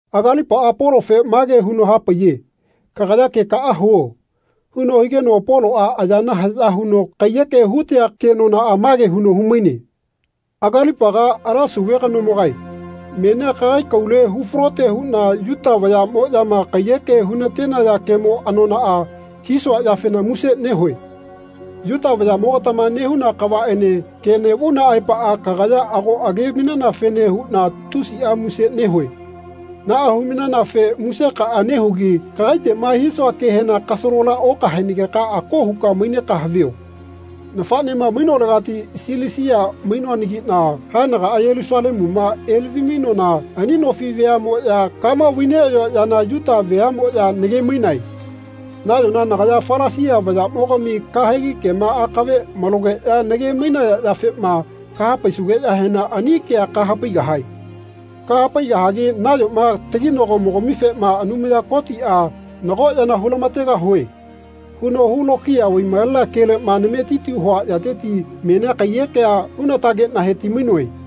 Agalipaꞌa Polofe mage huno hapaiye “Kagaya kekaꞌa huo.” huno higeno Poloꞌa ayana haꞌya huno kaiyeke hutea kenonaꞌa mage huno humaine. Agalipaga, ala sauve kanomogae, menia kagai kaule hufalote huꞌna Yuta vayaꞌmoꞌyama kaiyeke hunatenaya kemo anonaꞌa hisua yafena muse nehue. Yuta vayaꞌmogatama nehuna kavaꞌene ke neꞌvauna aepaꞌa kagaya ago age-mainanafene huꞌna tusiꞌa muse nehue. Naꞌa humainanafe musekaꞌa nehugi kagaiteꞌma hisua kehena kasalola okahaenageka ako huka maineka havio. Nafaꞌnema mainolegati Silisia mainoanagiꞌna haenagaꞌa Yelusalemuma elavi-mainoana ani nofi veamoꞌya kama vai-neꞌayoa yana Yuta veaꞌmoꞌya nage-mainae. Nayona nagaya Falasia vayaꞌmogami kahegi kema akave malogeꞌya nage-mainaya yafema kahapaisugeꞌyahena ani kea kahapaigahae. Kahapaigahagi nayoma taginagomogamifema Anumaya Kotiꞌa “Nago yana hulamategahue.” huno hulokiya vai-malenea keleꞌma nametiti hua yateti menia kaiyekea hunatageꞌna heti-mainoe.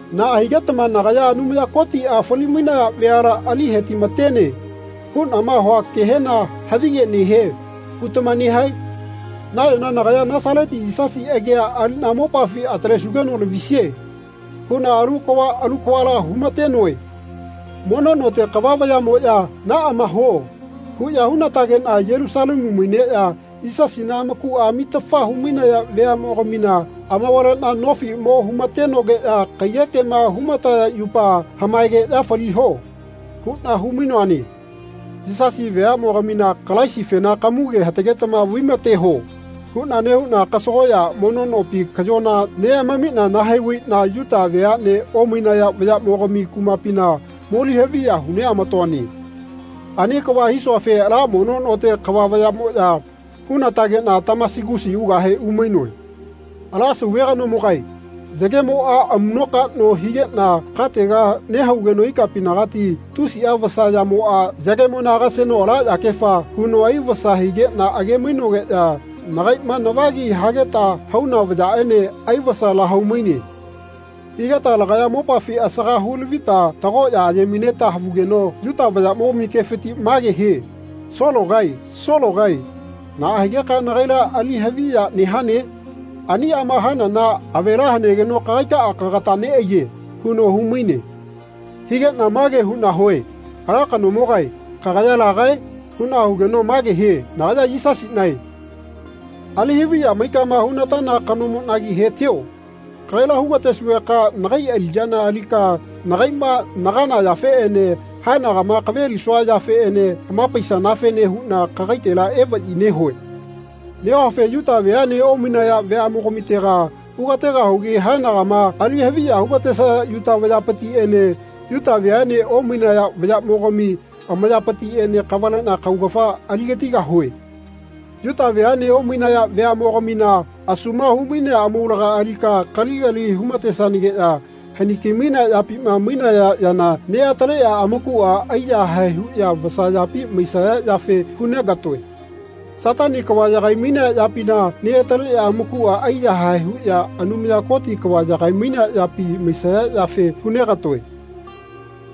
Naꞌa higetama nagaya “Anumaya Kotiꞌa fali-mainaya veala ali hetimatene.” huꞌnama hua kehena “Havige nehie.” hutama nehae? Nayona nagaya “Nasaleti Yisasi agia aliꞌna mopafi atalesugeno lavisie.” huꞌna alu kava alu kavala humatenoe. Mono note kava vayaꞌmoꞌya “Naꞌama huo.” huꞌya hunatageꞌna Yelusalemu maineꞌya Yisasina amakuꞌa amitafa humainaya veaꞌmogamina amavaleꞌna nofi mo humatenogeꞌya kaiyekema humataya yupa “Hamaegeꞌya faliho.” huꞌna humainoane. Yisasi veaꞌmogamina “Kalaisifena kamuge hatagetama vaimateho.” huꞌna nehuꞌna kasagoꞌya mono nopi kaꞌyona mo neꞌamamiꞌna nahai-vaiꞌna Yuta veaꞌne omainaya vayaꞌmogami kumapina moli-haviya huneꞌamatoane. Ani kava hisuafe ala mono note kava vayaꞌmoꞌya hunatageꞌna Tamasigusi ugahe umainoe. Ala Sauve kanomogae, yagemoꞌa amuꞌnokaꞌno higeꞌna katega nehaugeno ikapinagati tusiꞌa vasa yamoꞌa, yagemona agaseno ala yakefa, huno aivasa higeꞌna age-mainogeꞌya nagaiꞌma navagi hageta hauna vayaꞌene aivasa lahau-maine. Higeta lagaya mopafi asaga hu-lavita tagoꞌya aye-maineta havugeno Yuta vayaꞌmogami kefiti mage hie “Sologae Sologae naꞌa higeka nagaila ali haviya nehane? Aniꞌama hanana avela hanegeno kagaikaꞌa kagata neꞌaiye.” huno humaine. Higeꞌna mage huꞌna hue “Ala kanomogae kagaya lagae?” huꞌna hugeno mage hie “Nagaya Yisasiꞌnae ali-haviya maikama hunatana kanomoꞌnagi hetio. Kagaila hugatesugeka nagai aliꞌyana alika nagaiꞌma nagana yafeꞌene haenagama kavelisua yafeꞌene hamapaisanafene huꞌna kagaitela evaꞌyi nehue. Nehuafe Yuta veaꞌne omainaya veaꞌmogamitega hugategahugi haenagama ali haviya hugatesaya Yuta vayapitiꞌene Yuta veaꞌne omainaya vayaꞌmogami amayapitiꞌene kavaleꞌna kaugafa aligatigahue. Yuta veaꞌne omainaya veaꞌmogamina asuma humainea amaulaga alika kaligali humatesanageꞌya haniki-mainea yapima mainaya yana neꞌataleꞌya amakuꞌa aiyahae huꞌya vasa yapi maisaya yafe hunegatoe. Satani kava yagai-mainea yapina neꞌataleꞌya amakuꞌa aiyahae huꞌya Anumaya Koti kava yagai-mainea yapi maisaya yafe hunegatoe.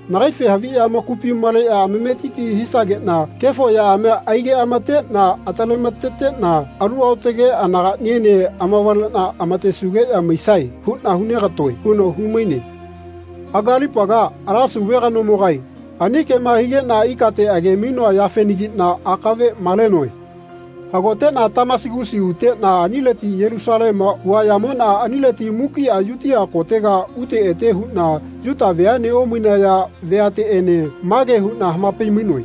Nagaife haviꞌya amakupi maleꞌya amametiti hisageꞌna kefo yaꞌamia aigeꞌamateꞌna atalemateteꞌna alu aotage anagaꞌniene amavaleꞌna amatesugeꞌya maisae huꞌna hunegatoe.” huno humaine. Agalipaga, ala Sauve kanomogae ani kema higeꞌna ikate age-mainoa yafenagiꞌna akave malenoe. Hagoteꞌna Tamasigusi uteꞌna anileti Yelusalemua uaꞌyamoꞌna anileti mukiꞌa Yutia kotega ute ete huꞌna Yuta veaꞌne omainaya veateꞌene mage huꞌna hamapai-mainoe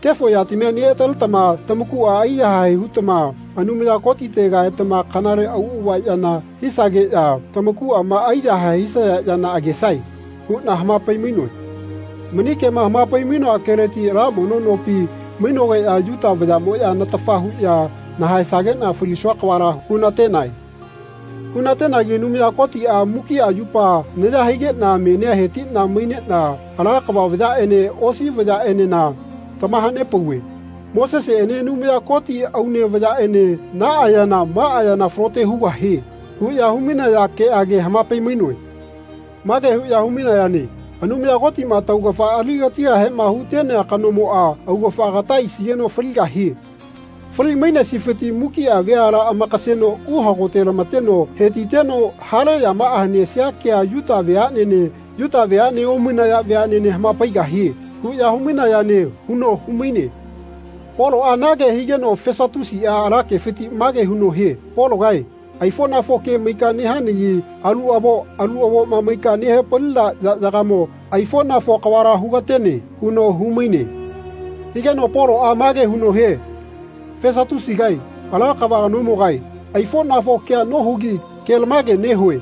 “Kefo yatamia neꞌataletama tamakuꞌa aiyahae hutama Anumaya Kotitega etama kanale auꞌava yana hisageꞌya tamakuꞌama aiyahae hisaya yana agesae.” huꞌna hamapai-mainoe. Mani kema hamapai-mainoa keleti ala mono nopi mainogeꞌya Yuta vayaꞌmoꞌya natafa huꞌya nahaesageꞌna falisua kavala hunatenae. Hunatenagi Anumaya Kotiꞌa mukiꞌa yupa naya higeꞌna menia hetiꞌna maineꞌna ala kava vayaꞌene osi vayaꞌenena tamahanepauve. Moseseꞌene Anumaya Koti aune vayaꞌene “Naꞌa yana maꞌa yana falote hugahie.” huꞌya humainaya keꞌage hamapai-mainoe. Mage huꞌya humainayane “Anumaya Kotiꞌma taugafa aligatigahema hutenea kanomoꞌa augafa agata aisigeno faligahie. Fali-mainesifiti mukiꞌa veala amakaseno uhagote-lamateno hetiteno hale yamaꞌa hanesia kea Yuta veaꞌnene Yuta veaꞌne omainaya veaꞌnene hamapaigahie.” huꞌya humainayane huno humaine. Poloꞌa na ke higeno Fesatusiꞌa ala kefiti mage huno hie “Pologae aifoꞌnafo ke maika nehanagi alu avo alu avoma maika nehapalina yaꞌyagamo aifoꞌnafo kavala hugatene.” huno humaine. Higeno Poloꞌa mage huno hie “Fesatusigae, ala kava kanomogae, aifoꞌnafo kea nohugi kelamage nehue.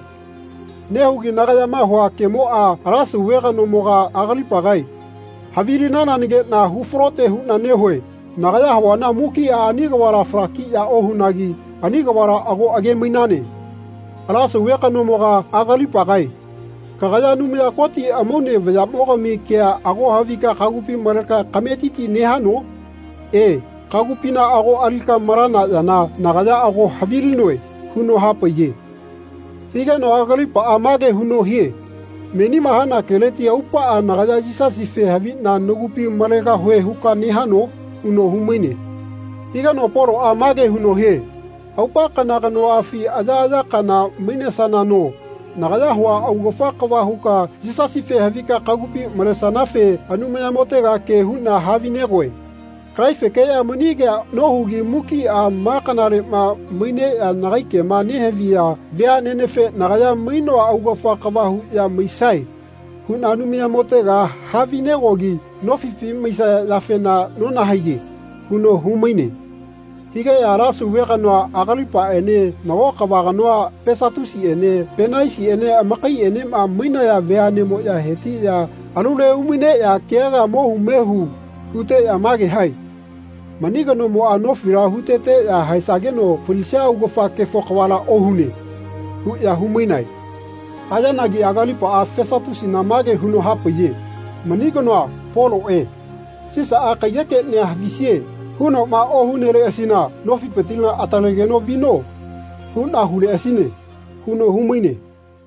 Nehugi nagayama hua kemoꞌa ala Sauve kanomoga Agalipagae havilinanageꞌna hufalote huꞌna nehue. Nagaya havuana mukiꞌa ani kavala falakiꞌya ohunagi ani kavala ago age-mainane. Ala Sauve kanomoga, Agalipagae, kagaya Anumaya Koti amaune vayaꞌmogami kea ago havika kagupi maleka kametiti nehano? E, kagupina ago alika malana yana nagaya ago havilinoe.” huno hapaiye. Higeno Agalipaꞌa mage huno hie “Menima hana keleti aupaꞌa nagaya Yisasife haviꞌna nagupi malegahue huka nehano?” huno humaine. Higeno Poloꞌa mage huno hie “Aupa kana kanoꞌafi ayaꞌaya kana mainesanano nagaya hua augafa kava huka Yisasife havika kagupi malesanafe Anumayamotega ke huꞌna havi-negoe. Kagaifekeꞌya mani kea nohugi mukiꞌa ma kanaleꞌma maineꞌya nagai kema nehaviya veaꞌnenefe nagaya mainoa augafa kava huꞌya maisae huꞌna Anumayamotega havinegogi nofipi maisaya yafena nonahaiye.” huno humaine. Higeꞌya ala Sauve kanoa Agalipaꞌene nago kava kanoa Fesatusiꞌene Penaisiꞌene amakaiꞌenema mainaya veaꞌnemoꞌya hetiꞌya alule umaineꞌya kea kea mohu mehu huteꞌya mage hae “Mani kanomoꞌa nofila huteteꞌya haesageno falisia augafa kefo kavala ohune.” huꞌya humainae. Hayanagi Agalipaꞌa Fesatusina mage huno hapaiye “Mani kanoa, Poloꞌe, ‘Sisaꞌa kaiyekeꞌnia havisie.’ hunoꞌma ohuneleꞌasina ‘Nofipitila atalegeno vino.’ huꞌna huleꞌasine.” huno humaine.